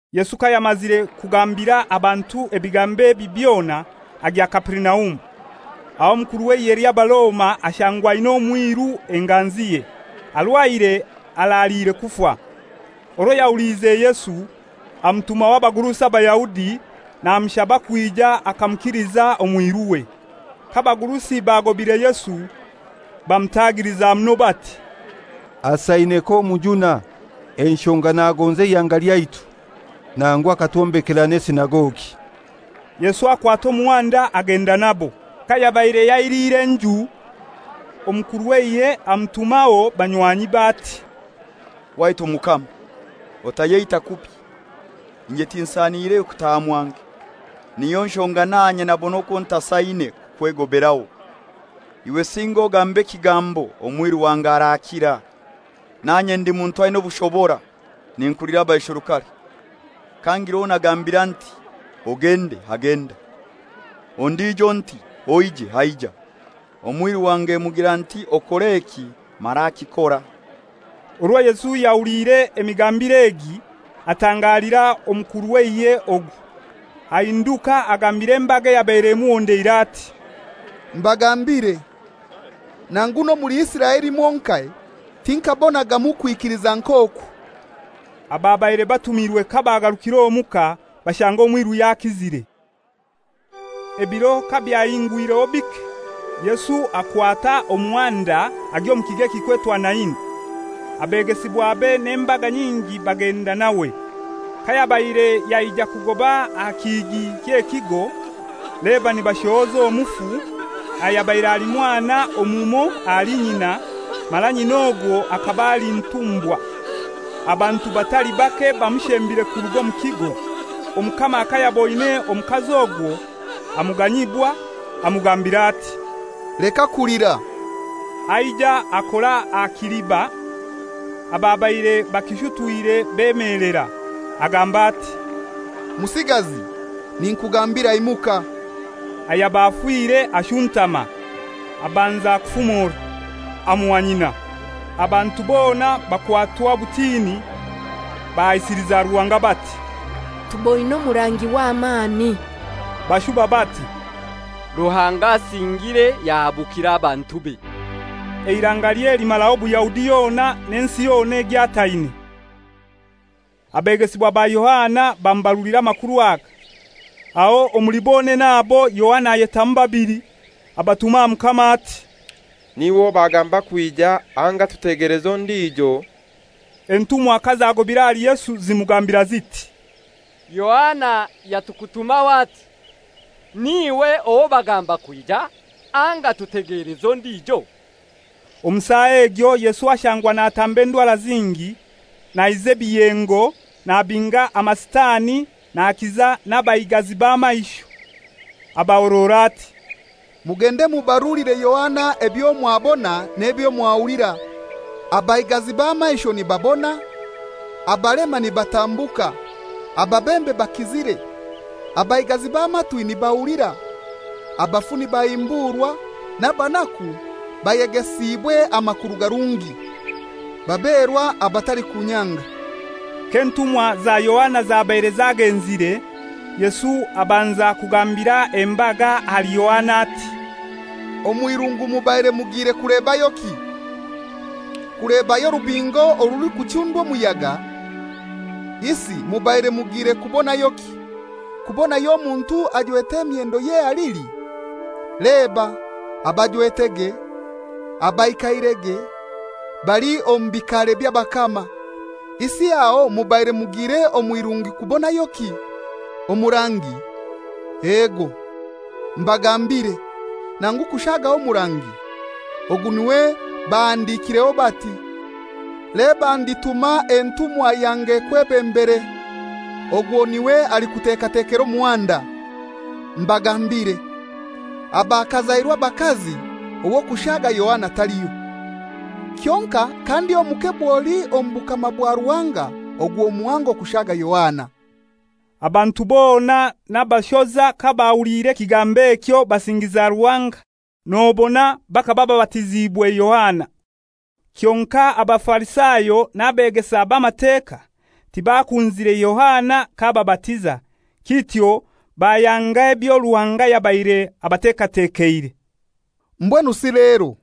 Yesu kayamazire kugambira abantu ebigambo ebi byona, agya Kaperinaumu. Aho omukuru w'eihe ly'Abaroma ashangwa aina omwiru enganziye, arwaire araliire kufa. Orwo yahuliize Yesu, amutumaho abagurusi Abayahudi, namushaba kwija akamukiliza omwiruwe. K'abagurusi bagobire Yesu, bamutagiliza muno bati, «Asaine k'omujuna, enshonga nagonza eihanga lyaitu, nangu akatwombekera n'esinagogi.» Yesu akwata omuhanda agenda nabo. Kayabaire yailiire haihi n'enju, omukuru w'eihe amutumaho banywanyibe ati, «Waitu Mukama, otayeita kubi; inye tinsaine iwe kutaaha mwange; niyo nshonga nanye nabona okwo ntasaine kukwegoberaho. Iwe singa ogambe ekigambo, omwiru wange arakira. Nanye ndi muntu aina obushobora, ninkulira abaisherukare: Kangira owo nagambira nti, ‹Ogende,› agenda; ondijo nti, ‹Oije,› aija; omwiru wange mugira nti, ‹Okore eki,› mara akikora.» Orwo Yesu yahuliire emigambire egi atangalira omukuru w'eihe ogu, ahinduka agambira embaga eyabaire emuhondeire ati, «Mbagambire, nangu n'omuli Isiraeli mwonkai, tinkaabonagamu kwikiliza nk'oku.» Ababaire batumirwe kabagarukire omuka, bashanga omwiru yakizire. Ebiro kabyahingwireho bike, Yesu akwata omuhanda agya omu kigo kilikwetwa Naini. Abegesibwabe n'embaga nyingi bagenda nawe. Kayabaire yaija kugoba aha kihigi ky'ekigo, leba nibashohoza omufu, ayabaire ali mwana omumoi ahali nyina, mara nyina ogwo akaba ali ntumbwa, abantu batali bake bamushembire kuruga omu kigo. Omukama kayaboine omukazi ogwo, amuganyibwa, amugambira ati, «Leka kulira.» Aija akora aha kiliba, ababaire bakishutwire bemelera. Agamba ati, «Musigazi, ninkugambira, imuka.» Ayaba afire ashuntama, abanza kufumora. Amuha nyina. Abantu bona bakwatwa obutini, bahaisiliza Ruhanga bati, «Tuboine omurangi w'amani!» Bashuba bati, «Ruhanga asingiire yahabukira abantube!» Eirangalye limaraho Buyahudi yona n'ensi yona egyataine. Abegesibwa ba Yohana bamubarulira amakuru aga. Aho omuli bonene abo Yohana ayetamu babili, abatuma aha Mukama ati, «N'iwe owo bagamba kwija, anga tutegeleze ondijo?» Entumwa kazagobire ahali Yesu zimugambira ziti, «Yohana yatukutumaho ati, ‹N'iwe owo bagamba kwija, anga tutegeleze ondijo?›» Omu saa egyo Yesu ashangwa natamba endwara zingi, naiza ebiyengo, nabinga amasitani, nakiza n'abaigazi b'amaisho. Abahorora ati, «Mugende mubarulire Yohana ebyo mwabona n'ebyo mwahulira: Abaigazi b'amaisho nibabona, abalema nibatambuka, ababembe bakizire, abaigazi b'amatwi nibahulira, abafu nibahimburwa, n'abanaku bayegesiibwe amakuru garungi. Baberwa abatalikunyanga.» K'entumwa za Yohana zabaire zagenzire, Yesu abanza kugambira embaga ahali Yohana ati, «Omw'irungu mubaire mugiire kulebayoki? Kulebayo orubingo orulikuchundwa omuyaga? Isi mubaire mugire kubonayoki? Kubonayo omuntu ajwete emyendo y'ehalili? Leba, abajwetege, abaikairege, bali omu bikaare by'abakama. Isi aho mubaire mugiire omw'irungu kubonayoki? Omurangi? Ego, mbagambire, nangu kushagaho omurangi. Ogu n'iwe bahandikireho bati, ‹Leba ndituma entuma yange ekwebembere, ogwo n'iwe alikutekatekera omuhanda.› Mbagambire, abakazairwe abakazi ow'okushaga Yohana taliho. Kyonkai kandi omuke bwoli omu bukama bwa Ruhanga ogwo muhango kushaaga Yohana.» Abantu bona n'abashoza kabahuliire ekigambo ekyo basingiza Ruhanga, nobona bakaba babatiziibwe Yohana. Kyonkai Abafarisayo n'abeegesa b'Amateka, tibakunzire Yohana k'ababatiza, kityo bayanga ebyo Ruhanga yabaire abatekatekeire. «Mbwenu si lero,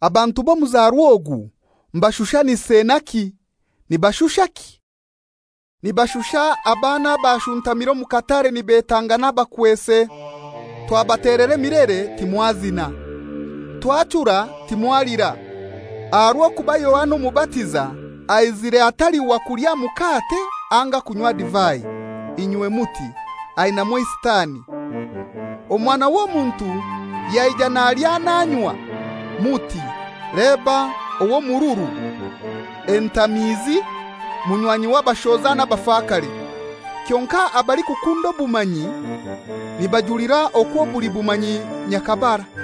abantu b'omuzarwa ogu mbashushanise naki, nibashushaki? Nibashusha abaana abashuntamire omu katare nibetangana bakwese, ‹Twabatelera emilere, timwazina, twachura, timwalira.› Aha rw'okuba Yohana Omubatiza aizire atali wa kulya mukate anga kunywa divai, inywe muti, ‹Ainamu eisitani.› Omwana w'Omuntu yaija nalya nanywa, muti, ‹Leba ow'omururu, entamiizi, munywanyi w'abashoza n'abafakare!› Kyonkai abalikukunda obumanyi nibajulira okwo buli bumanyi nyakabara.»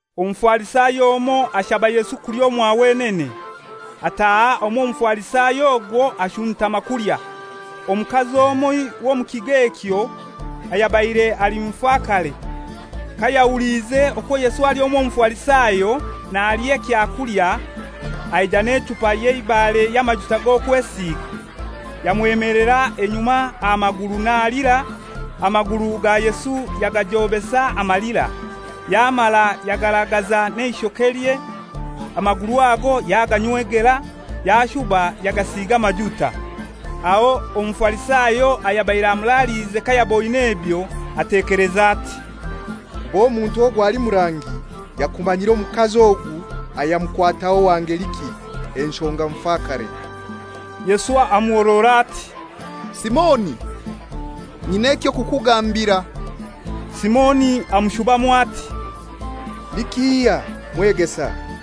Omufarisayo omoi ashaba Yesu kulya omwa wenene. Ataaha omw'Omufarisayo ogwo ashuntama kulya. Omukazi omoi w'omu kigo ekyo, ayabaire ali mufakare, kayahuliize okwo Yesu ali omw'Omufarisayo nalya ekyakulya, aija n'echupa y'eibare y'amajuta g'okwesiiga, yamwemelera enyuma aha maguru nalira, amaguru ga Yesu yagajobesa amalira, yamara yagaragaza n'eishokelye, amaguru ago yaganywegera, yashuba yagasiiga amajuta. Aho Omufarisayo ayabaire amuraliize kayaboine ebyo atekeleza ati, «Kuba omuntu ogu ali murangi, yakumanyire omukazi ogu ayamukwataho wa ngeliki, enshonga mufakare.» Yesu amuhorora ati, «Simoni, nyina eky'okukugambira.» Simoni amushubamu ati, «Ni kihai, Mwegesa?»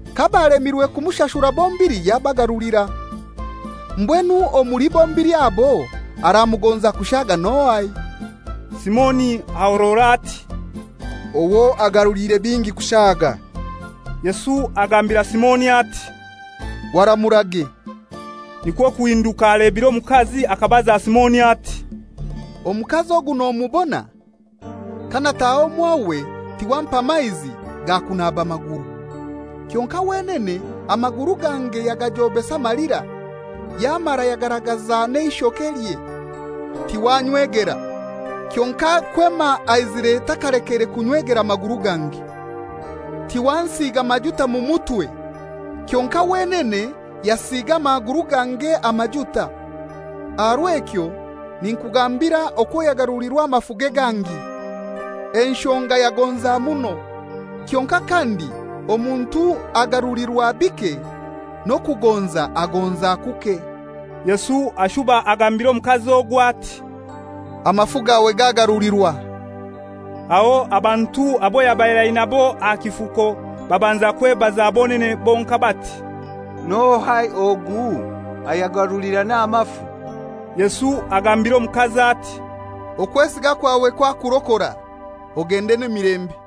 Kabalemirwe kumshashura bombili yabagarulira. Mbwenu omuli bombili abo aramugonza kushaaga n'ohai?» Simoni ahorora ati, «Owo agaruliire bingi kushaaga.» Yesu agambira Simoni ati, «Waramurage.» Nikwo kuhinduka alebire omukazi akabaza Simoni ati, «Omukazi ogu nomubona? Kanataha omwawe tiwampa maizi ga kunaba maguru. Kyonkai wenene amaguru gange yagajobesa amalira, yamara yagaragaza n'eishokelye. Tiwannywegera, kyonkai kwema aizire takalekeire kunnywegera gange. Tiwansiiga majuta mu mutwe, kyonkai wenene yasiiga amaguru gange amajuta. Aha rw'ekyo ninkugambira okwo yagarulirwa amafuge gangi, enshonga yagonza muno, kyonkai kandi omuntu agarulirwa bike n'okugonza agonza kuke.» Yesu ashuba agambira omukazi ogwo ati, «Amafu gawe gagarulirwa.» Aho abantu abo yabaire ainabo aha kifuko babanza kwebaza bonene bonkai bati, «N'ohai ogu, ayagarulira n'amafu?» Yesu agambira omukazi ati, «Okwesiga kwawe kwakurokora; ogende n'emilembe.»